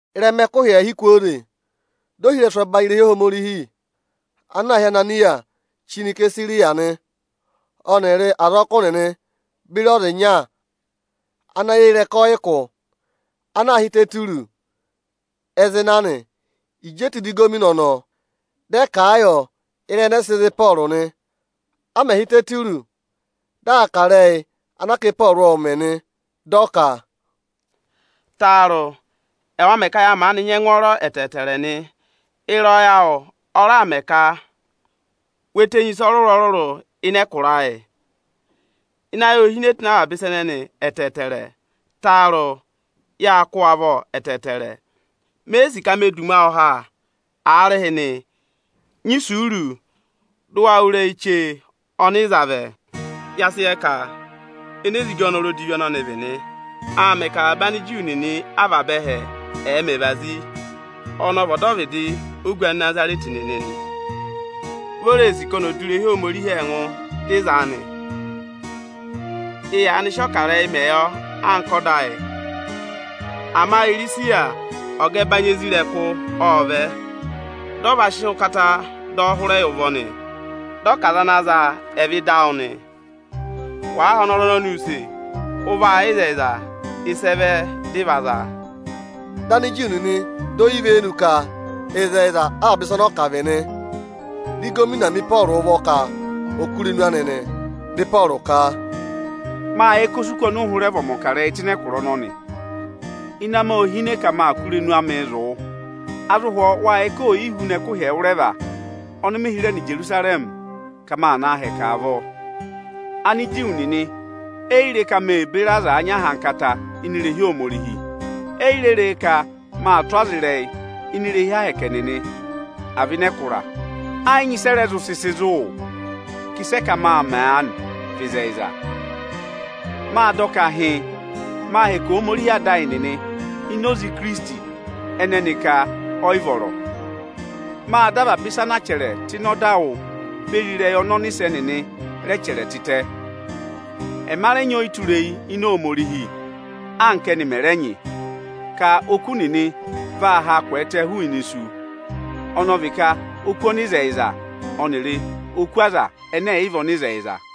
Ịrẹma ẹkụhị ẹẹhị kwooze, di ohirẹsụ ọbanyị irehi Ohomorihi ana aā hị́ Ananịya chí nọ Isesariya nị. Ọnịrị azọkụ nịnị beri ọza ịnya ana yẹ eyi ịrẹka ọyịkụ ana aā hị́ Iteturọsị ẹ zị na nị. Ịjị e tù ịda ịgọvọnọ ọnọọ, dị ẹ kà a yọ ịrẹyị ẹnẹẹ sị za Ịpọọrụ nị. A mẹ̀ hị́ Iteturọsị, dị aa kà ịrẹyị anaa ka Ịpọọrụ ộ mẹ̀ nị. Dị ọ ka, “Taarụ! Ẹwa mẹ ka ya maanị nyị ẹngwọọrọ ẹtẹẹtẹrẹ nị. Ịrẹyọyẹ awụ ọ raà mẹ ka we tenyi ịsa ọrụrụ-ọrụrụ ịnị ẹkụra ayị. Ịnị ayị ô hine tụ́ ịnị avaba ịsa ẹnẹnị ẹtẹẹtẹrẹ. Taarụ! Yâ kụ́ wụ avọ ẹtẹẹtẹrẹ. Me yi sì ka me du ụmẹ awụ ha. Aarịhịnị, nyị isuuru, dụ wa wụ́ ịrẹyị chee ọnị ị za vẹ. Ya sị yẹ ka enezigi ọ́nọrụ odivi ọnọnị vị nị. Aa mẹ ka avaba Aniju nịnị avaba ẹhẹ ệ mẹ ẹvazi. Ọnị ọ vị ọdọvịdị ogu Anịnazarẹtị nịnị nị. Vi o ree sì ka oni ò du irehi Ohomorihi ẹngụ, dị ị zaa nị. [Ị yaanị sị ọkarẹyị mẹ yọ anka ọda ayị; ama Irisiya ọga ọbanyị isoja nịnị ộ vẹ, dị ọ va sị ụkata dọ ọ hụrẹ yị ụvọ nị. Dị ọ ka aza ana zaa, ẹ̀ vẹ ịda awụ nị.] Wàa họ̀ ọnọrụ ọnọnị use, ụ vaa yẹ ịzẹyịza, ịsị ẹ vẹ dị ị va zaa.” Dị Aniju nịnị dọ ọ ivenu ka ịzẹyịza avaba ịsa ọnọọ kà vị nị. Di ịgọvọnọ mi Ịpọọrụ ụvọ ka ọ̀ kụ́ irenu anị nị. Dị Ịpọọrụ ka, “Mâ yẹ ka o si kù ọnị ụ hụrẹ vị ọmọkarẹyị tụ́ ịnị ẹkụra ọnọnị. Ịnẹ amị ô hine ka ma kà irenu amị zụ̀ wụ. A zụ hwọọ wâ yẹ ka o yi huna ẹkụhị ẹwụrẹva ọnị mị hịrẹ nọ Ijerusarẹmị ka ma na hẹkẹ avọọ. Aniju nịnị eyi re ka mê beri aza nyị ahankata ini irehi Ohomorihi. Eyi re re ka mâ tụ́ ọza ịrẹyị ini irehi Ohomorihi nịnị, àa vị ịnị ẹkụra Ẹ yị nyị ịsị ẹ rẹ zụ sị sị zụ̀ wụ ka ịsị ẹ ka mâ mẹ aanị vị ịzẹyịza. Mâ dọ ka hịịn, maa hẹkẹ Ohomorihi ada ayị nịnị ini oze Ikirisiti ẹnẹ ẹnị ka ọyị vọrọ. Mâ dọ avaba ịsa anaa chẹrẹ tụ́ ịnị ọda wụ́ beri ịrẹyị ọnị ọnịsẹ nịnị rẹ chẹrẹ tịtẹ. Ẹma rẹ nyị ọyịtureyi ini Ohomorihi, anka ẹ́nị mẹ̀ rẹ nyị, ka oku nịnị vaa haa kwẹẹtẹ hụụnị isu, ọnọọ vị ka oku ọnịzẹyịza ọnịrị oku aza ẹnẹ ẹ̀ yị vị ọnịzẹyịza.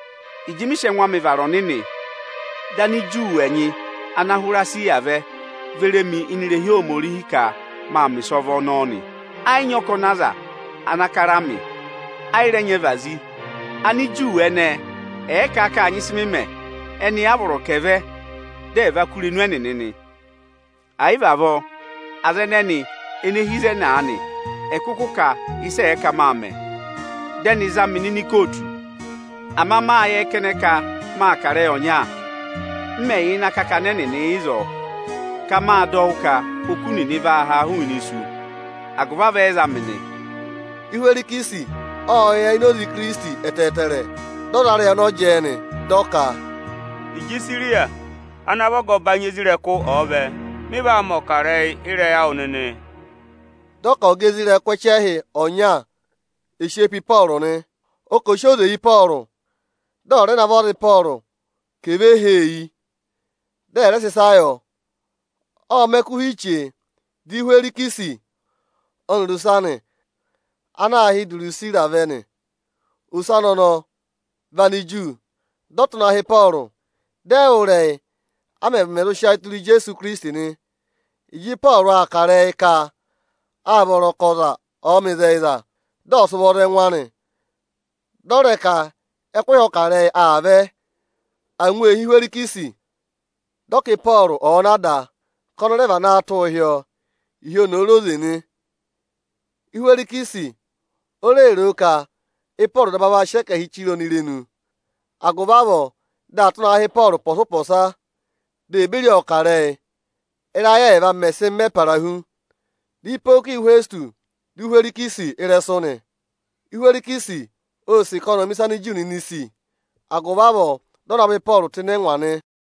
Ịjị mị sị ẹngụ amị vara ọnịnị, dị Aniju ẹnyị ana hụrẹ Esiya vẹ, ve re mi ini irehi Ohomorihi ka maa mẹ̀ ịsọvọ hi Ohomorihi nị. Ẹ yị nyị ọkọnị aza ana kara mị, ẹ yị rẹ nyị ẹvazi. Aniju ẹnẹẹ ẹ̀ẹ ka â nyị ịsị mị mẹ, ẹnị a vọrọ ka ẹ̀ vẹ, dị ẹ̀ va kụ́ irenu ẹnịnị nị. Ẹ̀ yị vị avọọ, aza ẹnẹnị ene hi ịzẹnị aanị, ẹ̀ kụkụ kà a ịsị ẹ ka mâ mẹ, dị ẹnị za mị nọ ịnị ikootu. Ama mâ yẹ kẹnẹ ka mâ kà ịrẹyị ọnya, m mẹ̀ yà ịnị akakana ẹnịnị ịzọọ ka mâ dọ wụ́ ka oku nịnị vaa haa hụụnị isu; agụvị avọọ ẹ za mị nị.” Ịhwẹrịsị ộ yẹ ini oze Ikirisiti ẹtẹẹtẹrẹ. Dị ọ za ịrẹyị ọnọọ jẹẹ nị. Dị ọ ka, “Ịjị Irisiya ana vị ọga ọbanyị isoja nịnị ọ̀ọ vẹ, mị vaa mẹ̀ ọkarẹyị ịrẹyị awụ nịnị.” Dị ọ ka ọga isoja nịnị ẹchẹhị ọnya ò sị eyi pe Ịpọọrụ nị. Ọ kà ọ̀ sị oze yị Ịpọọrụ, dị ọ̀ rẹ navọ aza Ịpọọrụ ka è ve hee yi, dị ẹ̀ rẹ sị ịsa yọ. Ộ mẹ ẹkụhị chee, di Ịhwẹrịsị ọnịrị ose anị ana aā hị́ Idirusira vẹ nị. Ose anị ọnọọ vị Aniju. Dị ọ tụ́ na hị́ Ịpọọrụ, dị ẹ wụ́ ịrẹyị, a mẹmẹ zụ sị ayị tụra Ijeesu Ikirisiti nị. Ịjị Ịpọọrụ aa kà ịrẹyị ka â vọrọ ka ọza ọ̀ọ mẹ ịzẹyịza, dị ọ̀ sị ụvọ za ẹngụ anị, dị ọ rẹ ka ẹkụhị ọkarẹyị aa vẹ, angwa ee hí Ịhwẹrịsị. Dị ọ ka Ịpọọrụ ọ̀ọ na da, ka ọnị rẹ vanaa tụ́ hị́ ọọ, ịhị oni òo re oze nị. Ịhwẹrịsị o re roo ka Ịpọọrụ daba vaa sị ẹkẹhịị chire ọnị irenu; agụvị avọọ dị aa tụ́ naa hị́ Ịpọọrụ ụpọsa-ụpọsa di ee beri ọọ kà ịrẹyị. Ị́rayị ẹẹva mẹ̀ sị mẹ para hu, dị Ịpọkịyọsị Ịhwẹsịtọsị dọ Ịhwẹrịsị ịrẹsụ nị. Ịhwẹrịsị ô sì ka ọnị ọ̀ mẹ ịsị Aniju nịnị sì, agụvị avọọ dị ọ navọ Ịpọọrụ tụ́ ịnị ẹngwa nị.